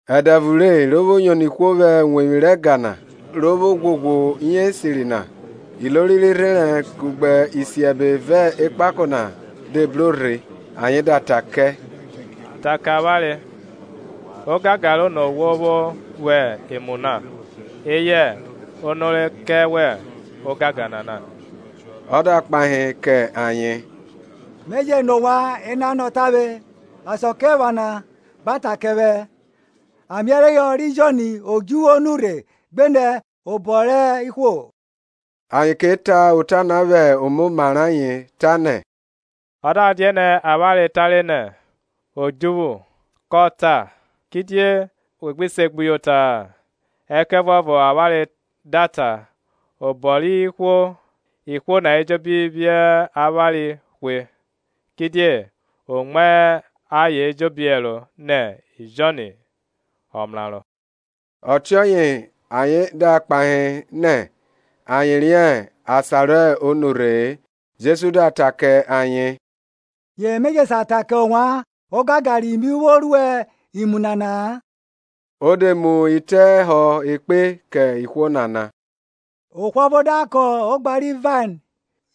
Ẹdẹ ọvo re, ro vwo yono ihwo na vwẹ uwevwi rẹ ẹga na ro vwo ghwoghwo iyenrẹ esiri na, ilori rẹ irherẹn kugbe isiẹbe vẹ ekpako na de bro rhe ayen da ta kẹ, Ta ke avwanre ogangan rẹ ono wo vwo ruẹ imu na, eyẹ ono re kẹ wẹ ogangan nana. Ọ da kpahe kẹ ayen, Me je nọ ovwan enanọ tavwe, Asakiephana gba ta kẹ vwẹ, Ameẹreyọ ri Jọn odjuvwu o nurhe gbenẹ obọ rẹ ihwo? Ayen ke ta ota na vwẹ omoma rẹ ayen, tanẹ, Ọ da dianẹ avwanre tare nẹ, Odjuvwu, kọ ta, Kidie we gbi se gbuyota-a? Ẹkẹvuọvo avwanre da ta, Obo rẹ ihwo, ihwo na ejobi phi avwanre hwe; kidie o mu ayen ejobi ẹro nẹ Jọn ọmraro. Ọtiọye ayen da kpahe nẹ ayen riẹn asan ro nurhe-e. Jesu da ta kẹ ayen, Ye me je sa ta kẹ ovwan ogangan ri mi vwo ruẹ imu nana-a. Ọ de mu itẹ họ ekpe kẹ ihwo nana. Ohwo ọvo da kọn ogba ri vain,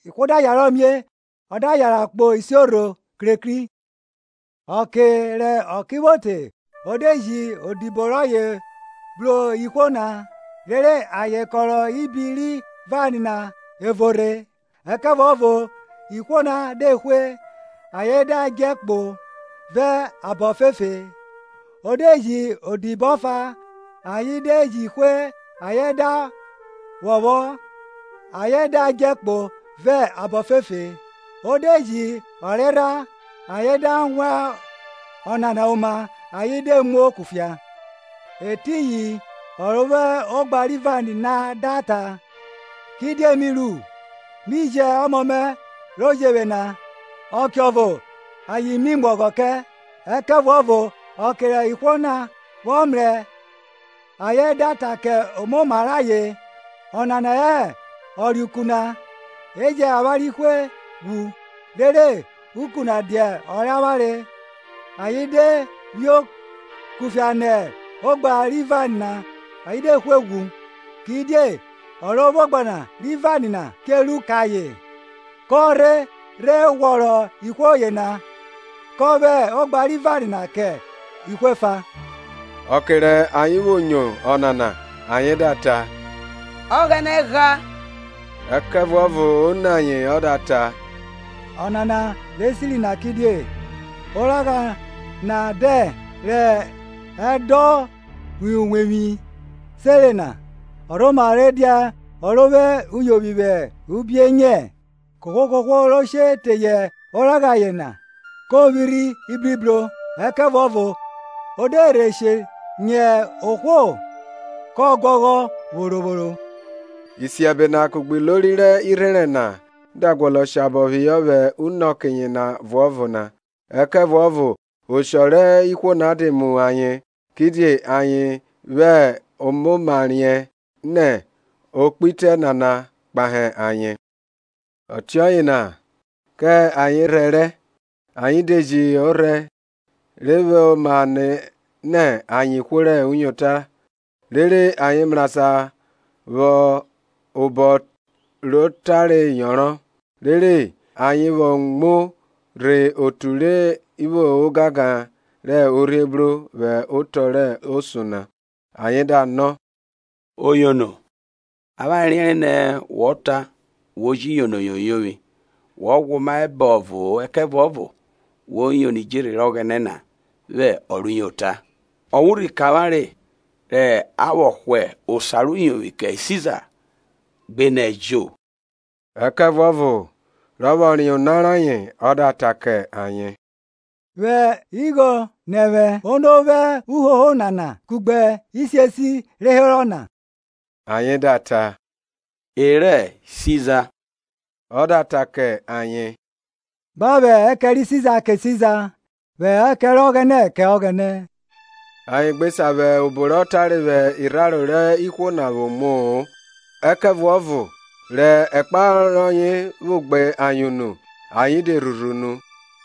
ihwo da yarọ mie, o da yanran kpo isiorho krekri. Ọke rẹ ọke vwo te, o de ji odibo rọye bru ihwo na, rere ayen kọrọ ibi ri vain na ẹvo rhe; ẹkẹvuọvo ihwo na de hwe, ayen da djẹ kpo vẹ abọ ofefe. O de ji odibo ọfa; ayen de ji hwe ayen da phọphọ, ayen da dje kpo vẹ abọ ofefe. O de ji ọrerha; ayen da wan ọnana oma ayen de muo kufia. Etiyin ọ ro vwo ogba ri vain na da ta, Kidie mi ru? Mi ji ọmọ mẹ ro jevwe na; ọkeọvo ayen mi mu ọghọ kẹ. Ẹkẹvuọvo ọke rẹ ihwo na vwọ mrẹ, ayen da ta kẹ omoma rẹ ayen, Ọnana hẹ ọreuku na; e jẹn avwanre hwe ghwu, rere, uku na dia ọ rẹ avwanre. Ayen de phio kufia nẹ ogba ri vain na ayen de hwe ghwu. Kidie ọ ro vwo ogba ri vain na che ru kẹ ayen? Kọ rhe rhe ghwọrọ ihwo yena, kọ vwẹ ogba ri vain na kẹ ihwo efa. Ọke rẹ ayen vwo nyo ọnana, ayen da ta, Ọghẹnẹ gha! Ẹkẹvuọvo o ni ayen ọ da ta, Ọnana re siri na kidie. Oragha na dẹn rẹ edovwọn uwevwi senre na ọ rhoma rhe dia ọ ro vwo uyovwi vwẹ ubienyẹ? Kohwo kohwo ro she teye oragha yena ko vwirhi ibribro; ẹkẹvuọvo o de rhe she nyẹ ohwo kọ guọghọ vworo vworo. Isiẹbe na kugbe ilori rẹ irherẹn na da guọnọ shabọ phihọ vwẹ unọke yena ọvuọvo na, ẹkẹvuọvo oshọ rẹ ihwo na de mu ayen; kidie ayen vwẹ omoma riẹn nẹ o kpe itẹ nana kpahe ayen. Ọtiọye na kẹ ayen rhẹrẹ, ayen de ji ọrhẹ, re vwẹ oma nẹ nẹ ayen ihwo rẹ uyota, rere ayen mrasan vwẹ obọ rọ tare yọnrọn, rere ayen vwo muo rhe otu ri vwo ogangan rẹ orhiebro vwẹ otọ rẹ osun na. Ayen da nọ, Oyono, avwanre riẹnre nẹ wọ ta wo ji yono yoyovwi, wọ ghwẹ oma hẹ abọvo-o, ẹkẹvuọvo wo yono idjerhe rẹ Ọghẹnẹ na vwẹ ọ rẹ uyota. Ọ wan urhi kẹ avawnre re a vwọ hwa osa rẹ uyovwi kẹ Siza, gbenẹ ẹjo? Ẹkẹvuọvo rọ vwọ riẹn ona rayen, ọ da ta kẹ ayen, Vwẹ igho nẹ vwẹ. Ono vwo uhoho nana kugbe isiesi re herọ na? Ayen da ta, E rẹ Siza. Ọ da ta kẹ ayen, Gba vwẹ ẹkẹn ri Siza kẹ Siza, vwẹ ẹkẹn rẹ Ọghẹnẹ kẹ Ọghẹnẹ. Ayen gbe sa vwẹ obọ rọ tare vwẹ irharo rẹ ihwo na vwo muo-o; ẹkẹvuọvo rẹ ẹkpahọ rọye vwo gbe ayen unu ayen de rhurhu unu.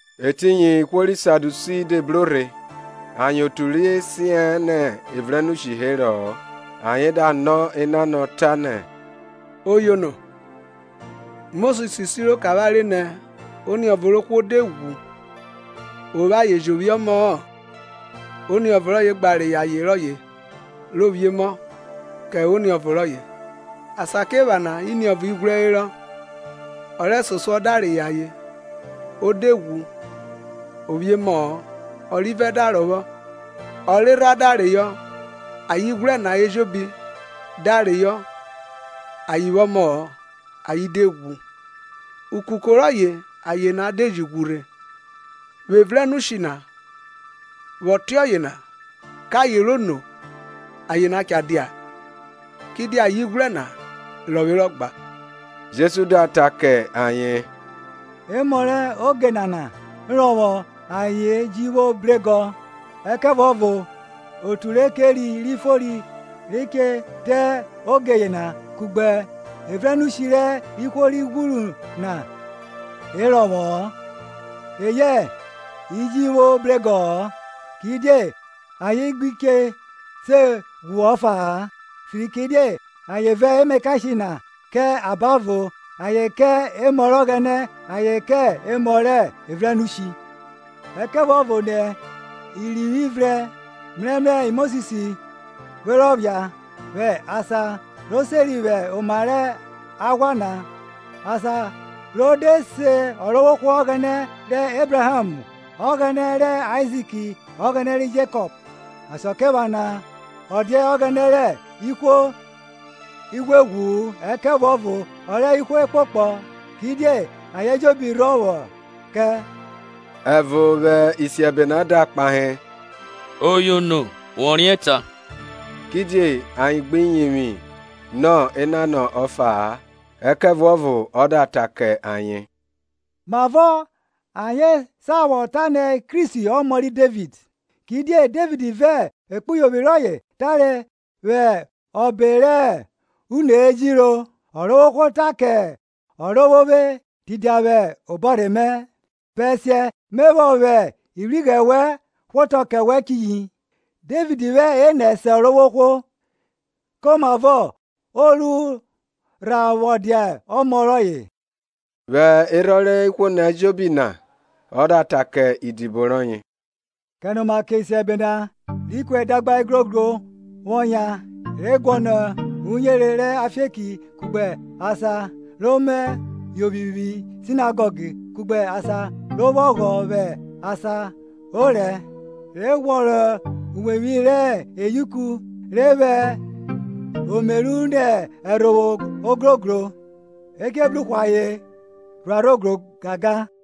Etiyin ihwo ri Sadiusi de bro rhe, ayen otu re sian nẹ evrẹnushi herọ-ọ, ayen da nọ enanọ, tanẹ, Oyono, Mosis siro kẹ avwanre nẹ oniọvo rẹ ohwo de ghwu, o vwo aye jẹ o vwiẹ emọ-ọ, Oniọvo rọye gba reyọ aye rọye ro vwiẹ emọ kẹ oniọvo rọye. Asakiephana iniọvo ighwrẹ herọ; ọ rẹsosuọ da reyọ aye, o de ghwu o vwiẹ emọ-ọ; ọrivẹ da rọvwọ; ọrerha da reyọ, ayen ighwrẹ na ejobi da reyọ ayen vwo emọ-ọ ayen de ghwu. Ukuko rọye aye na de ji ghwu rhe. Vwẹ evrẹnushi na, vwẹ ọtiọye na, kẹ aye rẹ ono aye na cha dia? Kidie ayen ighwrẹ na rọvwerọ gba? Jesu da ta kẹ ayen, Emọ rẹ oge nana rọvwọ ayen ji vwo bregọ; ẹkẹvuọvo otu re keri ri fori ri che te oge yena kugbe evrẹnushi rẹ ihwo ri ghwuru na e rọvwọ-ọ eyẹ e ji vwo bregọ-ọ, Kidie ayen gbi che se ghwu ọfa-a, fikiridie ayen vẹ emakashe na kẹ abavo ayen kẹ emọ rẹ Ọghẹnẹ, ayen kẹ emọ rẹ evrẹnushi. Ẹkẹvuọvo nẹ irivwi vrẹn, mrẹmrẹ Mosis vwe rọ phia, vwẹ asan re seri vwẹ oma rẹ aghwa na, asan ro de se Ọrovwohwo Ọghẹnẹ rẹ Ẹbraham Ọghẹnẹ rẹ Aizik Ọghẹnẹ ri Jekọp. Asakiephana ọ dia Ọghẹnẹ rẹ ihwo ighweghwu-u, ẹkẹvuọvo ọ rẹ ihwo ekpokpọ; kidie ayen ejobi rhọ vwọ kẹ. Ẹvo vwẹ isiẹbe na da kpahe, Oyono, wọ riẹn ta. Kidie ayen gbi yivwi nọ enanọ ọfa-a. Ẹkẹvuọvo ọ da ta kẹ ayen, Mavọ ayen vwọ sa ta nẹ Kristi ọmọ ri Devid? Kidie Devid vẹ ekpuyovwi rọye tare vwẹ Ọbe rẹ Une rẹ Ejiro, Ọrovwohwo ta kẹ Ọrovwovwe, Tidia vwẹ obọrhe mẹ, bẹsiẹ me vwọ vwẹ ivwighrẹ wẹn hwaọto kẹ wẹn chiyi. Devid vwẹ enẹ se Ọrovwohwo; komavọ o ru rha vwọ dia ọmọ rọye? Vwẹ erhọn rẹ ihwo ejobi na ọ da ta kẹ idibo rọye, Kẹnoma kẹ isiẹbe na, ri ku edagba igrogro vwọ yan, re guọnọ uyere rẹ afieki kugbe asan ro mẹ yovwi vwi sinagọg kugbe asan ro vwo ọghọ vwẹ asan orẹ, re ghwọrọ iwevwi rẹ eyauku re vwẹ omeru nẹ ẹrhovwo ogrogro. E che bru hwe ayen rhuarho gangan.